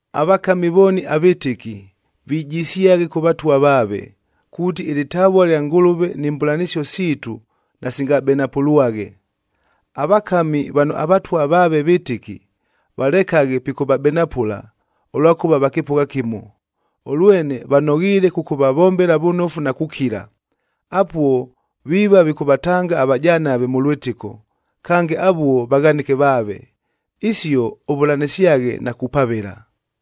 Avakami vooni avɨtɨki, vijisyaghe kʉ vatwa vaave, kuuti ɨlɨtavua lya Ngʉlʉve ni mbʉlanɨsio siitu nasingabenapʉlwaghe. Avakami vano avatwa vaave vɨtɨki, valekaghe pikʉvabenapʉla ʉlwakʉva va kɨpʉgha kɨmo. Ʉlwene vanoghiile kʉkʉvavombela vʉnofu na kukila, apuo viiva vikʉvatanga avajanave mʉ lwɨtɨko, kange avuo vaghanɨke vaave. Isio ʉvʉlanɨsyaghe na kupavɨla.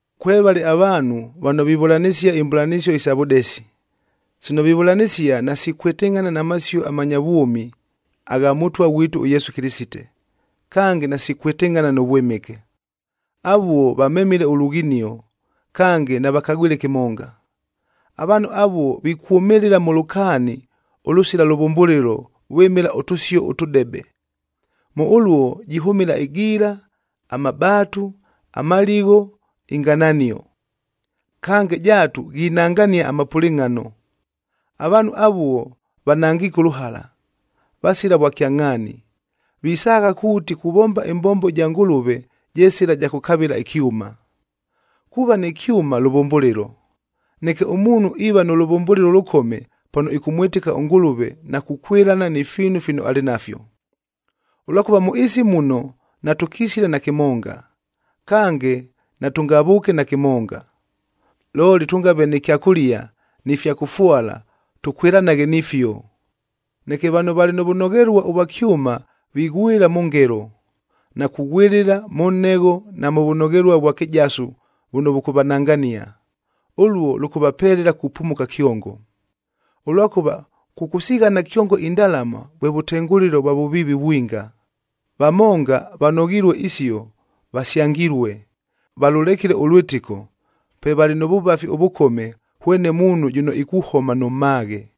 Kwevale avaanhu vano vivʉlanɨsia imbʉlanɨsio isa vʉdesi. Sino vivʉlanɨsia nasikwɨtɨngʼhana na masio amanya vwʉmi agha Mʉtwa ghwitu ʉYesu Kɨlɨsite, kange nasikwɨtɨngʼhana nʉ vwɨmɨke. Avuo vamemile ʉlughinio, kange navakagwile kɨmonga. Avaanhu avuo vikwʉmɨlɨla mʉ lʉkaani ʉlʉsila lʉvʉmbʉlɨlo vwɨmɨla ʉtʉsio ʉtʉdebe. Mʉ ʉluo jihʉmɨla ɨgiila, amabaatu, amaligho, ingananio. Kange, jaatu ghinangania amapʉlɨngʼhano. Avaanhu avuo vanangiike ʉlʉhala, vasila vwakyangʼhaani. Visaagha kuuti kuvomba ɨmbombo ɨja Ngʉlʉve je sɨla ɨja kʉkavɨla ɨkyʉma. Kuuva nɨ kyʉma lʉvʉmbʉlɨlo, neke ʉmuunhu iiva nʉ lʉvʉmbʉlɨlo ʉlʉkome, pano ɨkʉmwɨtɨka ʉNgʉlʉve na kukwɨlana ni fiinu fino alɨ nafyo. Ʉlwakʉva mʉ ɨɨsi muno natʉkisile na kɨmonga, kange natʉngavʉʉke na kɨmonga. Looli tʉngave nɨ kyakʉlia ni fya kʉfwala tʉkwɨlanaghe nifio. Neke vano valɨ nʉ vʉnoghelua ʉvwa kyʉma vighwɨla mʉ ngelo, na kughwɨlɨla mʉ nhegho na mʉ vʉnoghelua ʉvwa kɨjasu vʉno vʉkʉvanangania. Ʉluo lʉkʉvapelela kupumuka kyongo. Ʉlwakʉva kʉkʉsighana kyongo indalama vwe vʉtengʉlɨlo vwa vʉviivi vwinga. Vamonga vanoghilue isio vasyangilue, valʉlekile ʉlwɨtɨko, pe valɨ mʉ vʉvafi ʉvʉkome hwene muunhu jʉno ikuhoma nʉ mmaghe.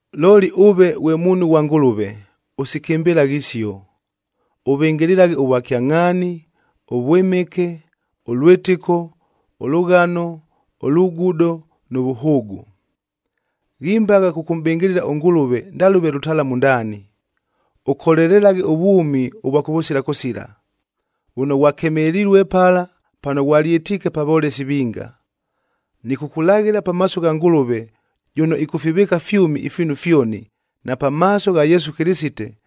Looli ʉve ghwe muunhu ghwa Ngʉlʉve, ʉsikɨmbɨlaghe isio. Ʉvɨngɨlɨlaghe ʉvwakyangʼhaani, ʉvwɨmɨke, ʉlwɨtɨko, ʉlʉghano, ʉlugudo nʉ vʉhʉʉgʉ. Ghimbagha kʉkʉmʼbɨngɨlɨla ʉNgʉlʉve ndalʉve lʉtalamu ndaani, ʉkolelelaghe ʉvwʉmi ʉvwa kʉvʉsila kʉsila, vʉno ghwakemelilue pala pano ghwalyɨtiike pa volesi vinga. Nɨkʉkʉlaghɨla pamaaso gha Ngʉlʉve jʉno ɨkʉfivɨɨka fyʉmi ifiinu fyoni, na pamaaso gha Yesu Kɨlɨsite,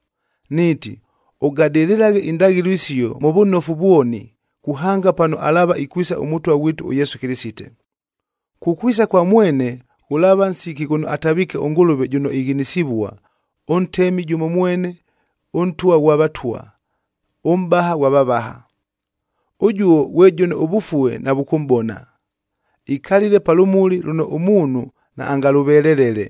niiti, ʉgadɨlɨlaghe indaghɨlo isio mʉ vʉnofu vwoni, kuhanga pano alaava ikwisa ʉMʉtwa ghwitu ʉYesu Kɨlɨsite. Kukwisa kwa mwene ghʉlaava nsiki ghʉno ataviike ʉNgʉlʉve jʉno ighinisivua, ʉNtemi jʉmo mwene, ʉNtwa ghwa vatwa, ʉMʼbaha ghwa vavaha. Ʉjuo ghwe jʉno ʉvʉfue navʉkʉmʼbona, ikalile pa lʉmuli lʉno ʉmuunhu naangalʉvelelele.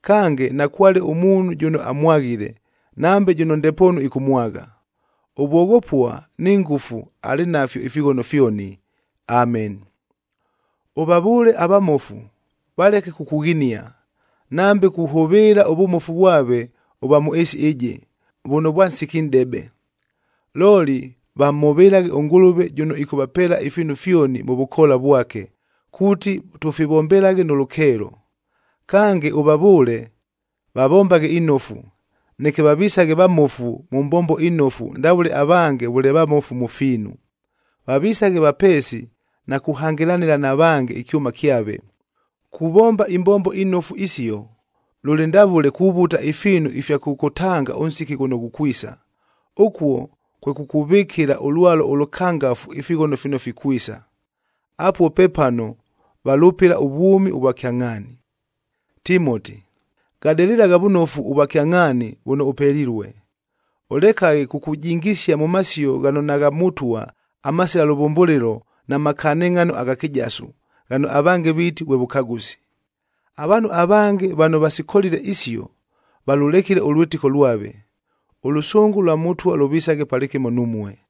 Kange, nakwale ʉmuunhu jʉno amwaghile, nambe jʉno ndepoonu ɨkʉmwagha. Ʉvwoghopua ni ngʉfu alɨ nafyo ifighono fyoni. Ameni. Ʉvavʉʉle avamofu valeke kukughinia, nambe kuhʉvɨɨla ʉvʉmofu vwave ʉvwa mʉ ɨɨsi ɨjɨ, vʉno vwa nsiki nʼdebe. Looli vamhʉvɨlaghe ʉNgʉlʉve jʉno ɨkʉtʉpeela ifiinu fyoni mʉ vʉkoola vwake, kuuti tʉfivombelaghe nʉ lʉkeelo. Kange, ʉvavʉʉle vavombaghe inofu, neke vavisaghe vamofu mʉ mbombo inofu ndavʉle avange vʉle vamofu mʉ fiinu. Vavisaghe vapeesi na kuhangɨlanɨla na vange ɨkyʉma kyave. Kuvomba imbombo inofu isio, lʉlɨ ndavʉle kuvuta ifiinu ifya kʉkʉtanga ʉnsiki ghʉno ghukwisa, ʉkuo kwe kukuvɨkɨla ʉlwalo ʉlʉkangafu ifighono fino fikwisa. Apuo pepano valʉpɨla ʉvwʉmi ʉvwa kyangʼhaani. Timoti, gadɨlɨlagha vʉnofu ʉvwakyangʼhaani vʉno ʉpelilue. Ʉlekaghe kukujingisia mʉ masio ghano nagha Mʉtwa amasila lʉvʉmbʉlɨlo na makanɨngʼhano agha kɨjasu, ghano avange viiti vwe vʉkagʉsi. Avaanhu avange vano vasikolile isio, valʉlekile ʉlwɨtɨko lwave. Ʉlʉsʉngʉ lwa Mʉtwa lʉvisaghe palɨkɨmo numue.